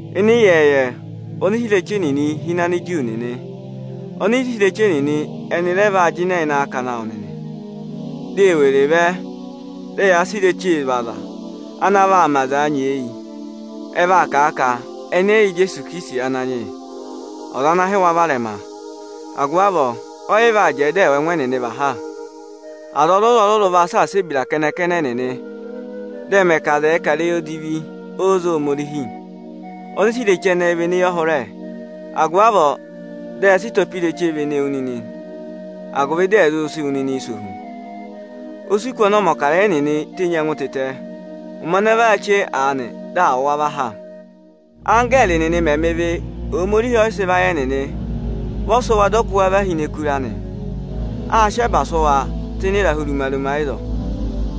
Ịnị ịyẹẹyẹ, ọnịsẹ ireche nịnị hi ini Aniju nịnị. Ọnịsẹ ireche nịnị ẹnị rẹ vaa jịnẹ ịnị akakana awụ nịnị. Di e were vẹ, dị ẹyaa sị irechee zụ̀ aza, ana vaa mẹ azaa nyeeyi. Ẹ vaa kà a ka ẹnị ẹ́ yị yẹ Ijeesu Ikirisiti Ananyị yị, ọza ana hị́ wa varẹma. Agụvị avọọ, ẹ́ yị vaa jẹẹ, dị ẹ̀ wụ ẹngụ ẹnịnị và ha. Aza ọrụrụ-ọrụrụ vaa saasa ebira kẹnẹ-kẹnẹ ẹnịnị, dị ẹ mẹ ka aza ẹ̀ẹ kà ịrẹyị odivi oze ịzẹyịza Ohomorihi. Ọnịsẹ ireche ẹnẹẹ vị eneyọhụrẹ, agụvị avọọ dị ẹyaa sị ịtọpa irechee vene wu nịnị, agụvị dị ẹ̀ zụ sị wụ nịnị sẹ ohu. O si kù ọnị ọmọkarẹyị ẹnịnị tenyi ẹngụ tịtẹ. Ụmẹ ana vọ aa chee aanị, dị à wụ̀ wa vá ha. Anggẹẹrị nịnị mẹ̀ mẹ ịvị, Ohomorihi ẹ́ yị sị vayị ẹnịnị. Vị ọ sị wa, dị ọ kụ wa va hi ini ẹkụra ịra nị. Â sị ẹba sụ́ wa tụ́ ịnị ịrahụ ruma-ruma ịzọọ.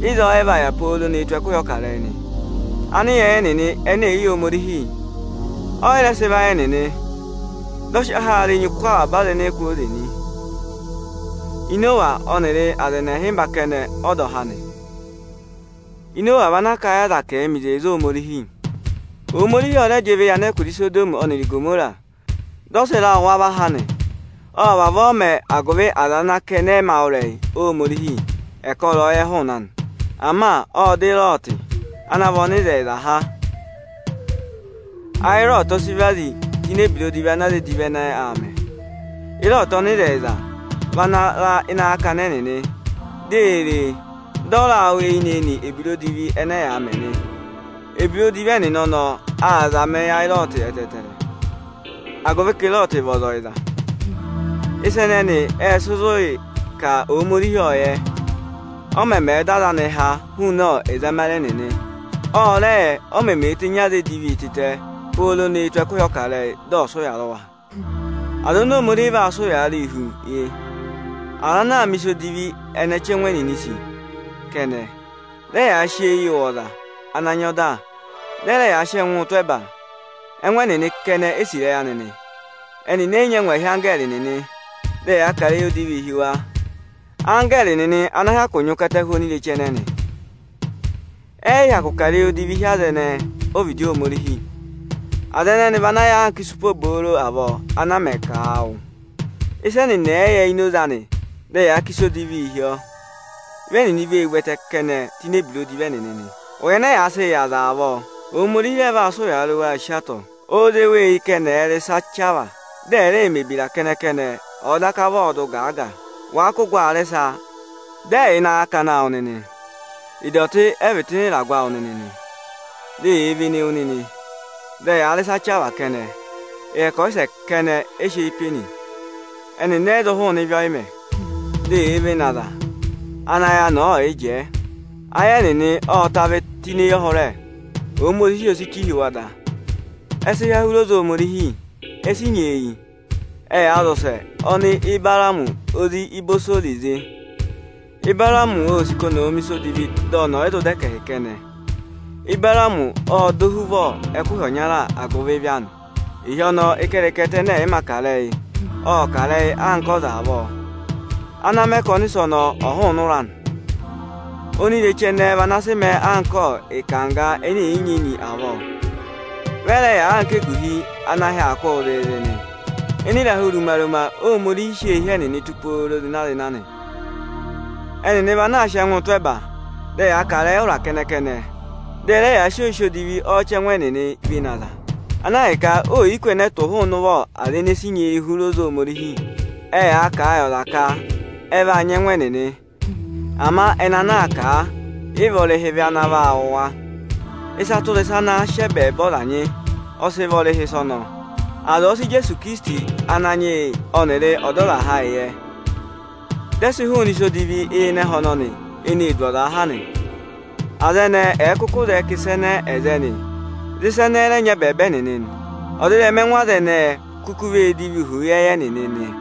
Ịzọọ ẹ vaa yà pooro nee tù ẹkụhị ọkarẹyị nị. —7.24Anịyẹẹyẹ nịnị ẹnẹ ẹ̀ yị yẹ Ohomorihi, ẹ́ yị sị vayị ẹnịnị. Dị ọ sị ọhaara enyi kụ́ wa kwooze nị. Inowa ọnịrị aza ẹnị ịhịmba kẹnẹ ọ dọ há nị. Inowa vị anaā kà a yị aza ka ẹ̀ẹ mẹ̀ ịsa ana vọrọ eyi Ohomorihi. Ohomorihi ọ rẹ jị ịvị yị anẹkụra Isodọmị ọnịrị Igomora, dị ọ sị ịra wụ̀ wa vá ha nị. Ộ vavọọ mẹẹ, agụvị aza ana ka ẹnị ẹ mā wụ́ ịrẹyị Ohomorihi ẹ̀ kọ ịrẹyọyẹ hụụnị anị. Ama ộ dọ Ịrọọtị ana vị ọnịzẹyịza há. Ayị Ịrọọtị vị ana vazi tụ́ ịnị ebira odivi ana aza edivi ẹnẹẹ aa mẹ. Ịrọọtị ọnịzẹyịza vị ana ra ịnị akakana ẹnịnị, dị ee ree, dị ọ raa wụ́ eyinị-eyinị ebira odivi ẹnẹ ẹyaa mẹ nị. Ebira odivi ẹnịnị ọnọọ aa zàmà ayị Ịrọọtị ẹtẹẹtẹrẹ, agụvị ka Ịrọọtị vị ọza ọyịza. Ịsa ẹnẹnị ệ sị zụ ka Ohomorihi ọ́ọ yẹ, ọ mẹmẹẹ̄ dọ aza anịị há hụụnị ẹzamare ẹnịnị. Ọ rẹ yẹ, o memeē tenyi aza edivi tịtẹ, pooro nee tù ẹkụhị ọkarẹyị, dị ọ sị ụya rị wa. Aza oni Ohomorihi vaa sị ụyaa rịị hu yị: Aza ana aa mẹ̀ ịsa edivi ọnị ọchẹngụ ẹnịnịị̄ sì kẹnẹ, dị ẹyaa sị eyii wụ̀ aza ana nyị ọda, dị ẹ rẹ yaa sị ẹngụụ tụ́ ẹba, ẹngụ ẹnịnị kẹnẹ e sì ịrẹyị anị nị, ẹnịnị ẹ́ yị nyị angwahi anggẹẹrị nịnị, dị ẹyaa kà ịrẹyị odivii hi wa. Anggẹẹrị nịnị ana hyakụ nyị ụkata huni onireche ẹnẹnị, ẹ́ yị hyakụ kà ịrẹyị odivi hi aza ẹnẹẹ ọ́vịdị Ohomorihi. Aza ẹnẹnị vị ana ya anka ịsụpa obooro avọọ ana a mẹ ka àa wụ. Ịsị ẹnịnị ẹ yị yẹ ini oze anị, dị ẹyaa kà odivii hi ọ. Vị ẹnịnị vee vú ẹtẹ kẹnẹẹ tụ́ ini ebira odivi ẹnịnị nị. Ụya ẹnẹ yaa sịị yị aza avọọ, Ohomorihi rẹ vaa sị ụyaa rị waa si atọ. Óo zé wa eyi ka ẹnị ẹ̀ẹ rị ịsa chavaa, dị ẹ̀ rẹẹ mẹ̀ ebira kẹnẹ-kẹnẹ, ọ̀ọ daka vị ọọdụ gaaga. Wàa kụ́ gụ aa rị ịsa, dị ẹ yà ịnị akakana awụ nịnị nị; ịdọtị ẹ vị tụ́ ịnị ịragụ awụ nịnị nị, dị eyee vene wu nịnị, dị ẹyaa rị ịsa chavaa kẹnẹ. Ịrẹkọyịsẹ kẹnẹ ẹ sị eyi pe nị, ẹnịnị ẹ́ yị zụ hụụnị ịvị ọyị mẹ. Di eyee vene aza ana ayị anị ẹ̀ yị jẹẹ. Ayị ẹnịnị ọọ ta vị tụ́ ini eyọhụrẹ, Ohomorihi o ree chì hi wa da. Ẹ sị há hụrị oze Ohomorihi, e si nyeeyi. Ẹyaa zị ụsẹ ọnị Ịbaraamị ozi Ịbọsọ zị. Ịbaraamị ô sì ka ọnị ọ̀ mẹ̀ ịsa odivi dị ọnị ọ̀ yị zụ nyị ẹkẹhị kẹnẹ. Ịbaraamị ộ dọ ohuvọ ẹkụhị ọnya agụvị ịvị anị. Ịhị ọnọọ, ịkẹrịkẹtẹ ẹnẹ ẹ̀ yị ma kà ịrẹyị, ộ kà ịrẹyị anka ọza avọọ, ana mẹ ka ọnịsẹ ọnọọ ọ̀ hụụnị ụra anị. Onireche ẹnẹẹ vị ana sị mẹẹ anka ịkangga ẹnẹ ẹ̀ yị nyị enyi avọọ. Vị ẹ rẹ yà anka eguhi ọnị ahị aa kụ́ụ zịịzị nị. Ịnị ịrahụ ruma-ruma Ohomorihi sị eehi ẹnịnị tụ́ pooro zịna-zịna nị. Ẹnịnị vị anaā sịị ẹngụụ tụ́ ẹba, dị ẹyaa kà ịrẹyị ụra kẹnẹ, dị ẹ rẹ yaa sị oyisì odivi ọchẹngụ ẹnịnịị vene aza, ana ahịka oò yi kù ẹnẹ ẹ tụ̀ hụụnị ụvọ aza ene si nyeeyi hụrị oze Ohomorihi. Ẹyaa kà a yị aza ka ẹ vaa nyị ẹngụ ẹnịnị, ama ẹnị ana aa kà a, yị vị ọrịhị ịvị ana vaa wụ̀ wa. Ịsa tụra ịsa ana àa sị ẹbẹẹba ọza nyị, ọ sị vara ọrịhị ịsa ọnọọ. Aza ọ̀ọ sị Ijeesu Ikirisiti Ananyị yị ọnịrị Ọdọzaha ayị yẹ, dị ẹ sị hụụnị ịsa edivi ịnị ẹhẹ ọnọnị eneē du ọzaa ha nị, aza ẹnẹẹ ẹ̀ẹ kụkụ zẹẹ ka ịsa ẹnẹẹ ẹ̀ za ẹnị, dị ịsa ẹnẹẹ ẹ̀ rẹ nyị ẹbẹẹba ẹnịnị, ọdịrẹma ẹhẹ aza ẹnẹẹ o kuku vee divii hu ịyẹẹyẹ ẹnịnị nị.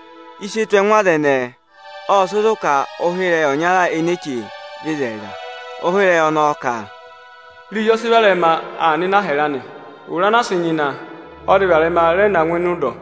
Ịsị e tù ẹngụ aza ẹnẹẹ, ọ́ọ sị zụ̀ ka ụhịrẹyị ọnya ene eē che, vị ịzẹyịza. Ụhịrẹyị ọnọọ ka: Irezi ọ sị varẹma aa nọ ịnị ịhyẹrẹ anị. Ụra ana á sị hụ enyi, ọ zị varẹma rẹ na ngụ ịnị ụdọ.